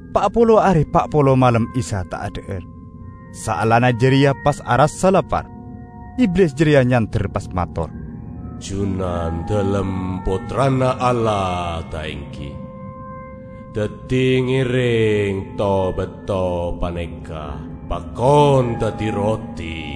Pa' polo are pa' polo malem Isa ta' adha'ar. Saellana jareya pas arassa lapar. Iblis jareya nyander pas mator, "Junandalem Pottrana Allah, ta' enggi? Daddi, ngereng to-bato paneka pakon daddi roti."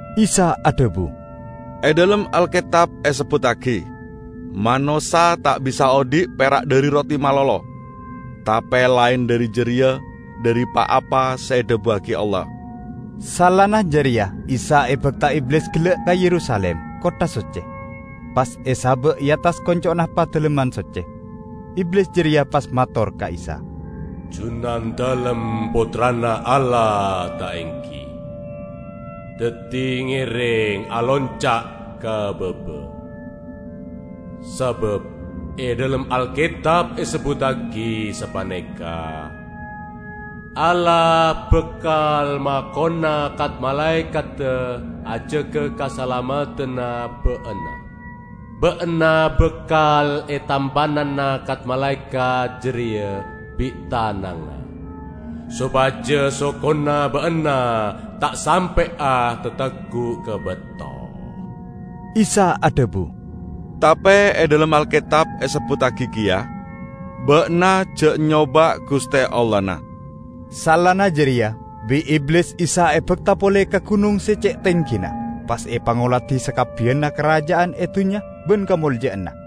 Isa adhabu, "E dhalem Alketab esebbuttagi: Manossa ta' bisa odhi' pera' dhari roti malolo, tape laen dhari jareya dhari pa-apa se edhabuwagi Allah." Saellana jareya Isa ebakta Iblis gella' ka Yerusalim, kottha socce, pas esaba' e attas konco'na Padalemman Socce. Iblis jareya pas mator ka Isa, "Junandalem Pottrana Allah, ta' enggi? Daddi, ngereng alonca' ka baba; sabab e dhalem Alketab esebbuttagi sapaneka, 'Allah bakal makona kat-malaekadda ajaga kasalameddanna Ba'na, Ba'na bakal etampanana kat-malaekat jareya bi' tanangnga, sopaja sokona Ba'na ta' sampe'a tatagguk ka bato.' " Isa adhabu, "Tape e dhalem Alketab esebbuttagi keya, 'Ba'na ja' nyoba' Guste Allahna.' " Saellana jareya bi' Iblis Isa ebakta pole ka gunong se ce' tenggina pas epangoladi sakabbiyanna karaja'an e dunnya ban kamolja'anna.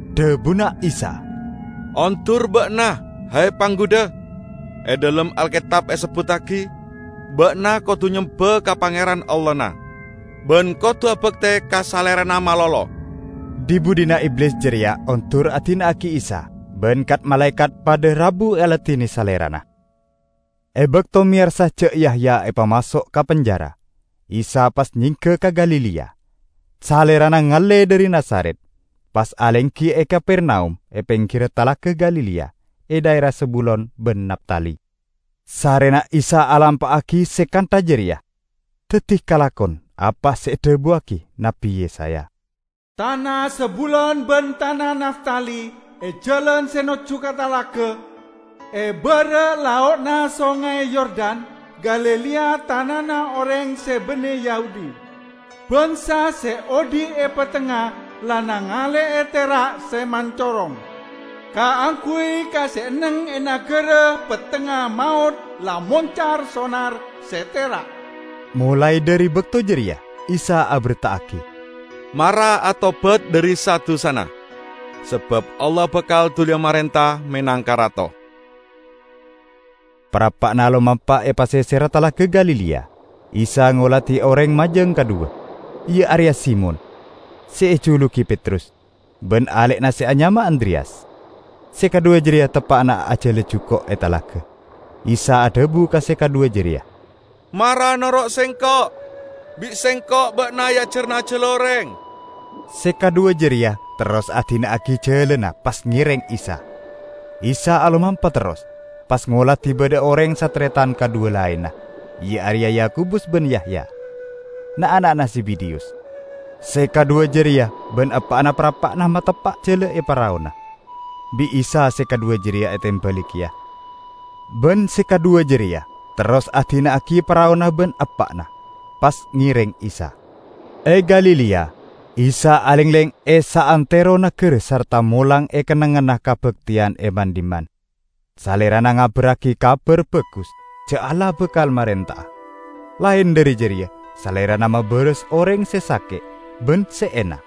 Dhabuna Isa, "Ondur ba'na, he Panggudha! E dhalem Alketab esebbuttagi, 'Ba'na kodu nyemba ka Pangeran, Allahna, ban kodu abakte ka Salerana malolo!' " Dhi-budhina Iblis jareya ondur adina'agi Isa, ban kat-malaekat padha rabu aladine Salerana. E bakto meyarsa ja' Yahya epamaso' ka penjara, Isa pas nyengga ka Galilea. Salerana ngalle dhari Nazaret, pas alenggi e Kapernaum e penggirra Talaga Galilea e dhaera Zebulon ban Naftali. Sarrena Isa alampa'agi se kantha jareya, daddi kalakon apa se edhabuwagi Nabbi Yesaya: "Tana Zebulon ban tana Naftali, e jalan se nojju ka talaga, e bara' lao'na Songay Yordan, Galilea tanana oreng se banne Yahudi! Bangsa se odhi' e pettengnga la nangale'e tera' se mancorong! Kaangguy ka se enneng e nagara pettengnga maot la moncar sonar se tera'!" Molae dhari bakto jareya Isa aberta'agi, "Mara atobat dhari sa-dusana, sabab Allah bakal duliya marenta menangka Rato!" Parappa'na alomampa e paseserra Talaga Galilea, Isa ngoladi oreng majang kadhuwa, iya areya Simon (se ejulugi Petrus) ban ale'na se anyama Andreyas. Se kadhuwa jareya teppa'na ajala juko' e talaga. Isa adhabu ka se kadhuwa jareya, "Mara noro' Sengko'. Bi' Sengko' ba'na eajarana ajala oreng." Se kadhuwa jareya terros adina'agi jalana pas ngereng Isa. Isa alomampa terros, pas ngoladi badha oreng sataretan kadhuwa laenna, iya areya Yakobus ban Yahya, na'-ana'na Zebedeyus. Se kadhuwa jareya ban eppa'na parappa'na mateppa' jala e paraona. Bi' Isa se kadhuwa jareya etembali keya, ban se kadhuwa jareya terros adina'agi paraona ban eppa'na, pas ngereng Isa. E Galilea, Isa alengleng e saantero nagara sarta molang e kennengnganna kabakteyan e man-dhimman. Salerana ngabarragi Kabar Bagus ja' Allah bakal marenta'a. Laen dhari jareya Salerana mabaras oreng se sake' ban se ena.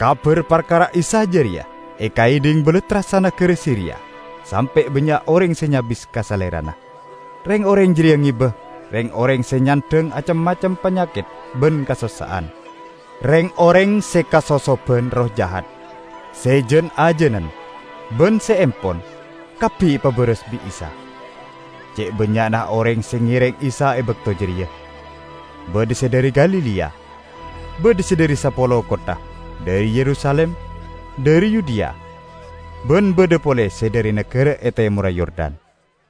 Kabar parkara Isa jareya ekaedhing balattra sanagara Siria, sampe' bannya' oreng se nyabis ka Salerana. Reng-oreng jareya ngeba reng-oreng se nyandhang acem-macem panyaket ban kasossa'an. Reng-oreng se kasosoban erroh jahat, se jan-ajanen, ban se empon, kabbi epabaras bi' Isa. Ce' bannya'na oreng se ngereng Isa e bakto jareya. Badha se dhari Galilea, badha se dhari Sapolo Kottha, dhari Yerusalim, dhari Yudea, ban badha pole se dhari nagara e temorra Yordan.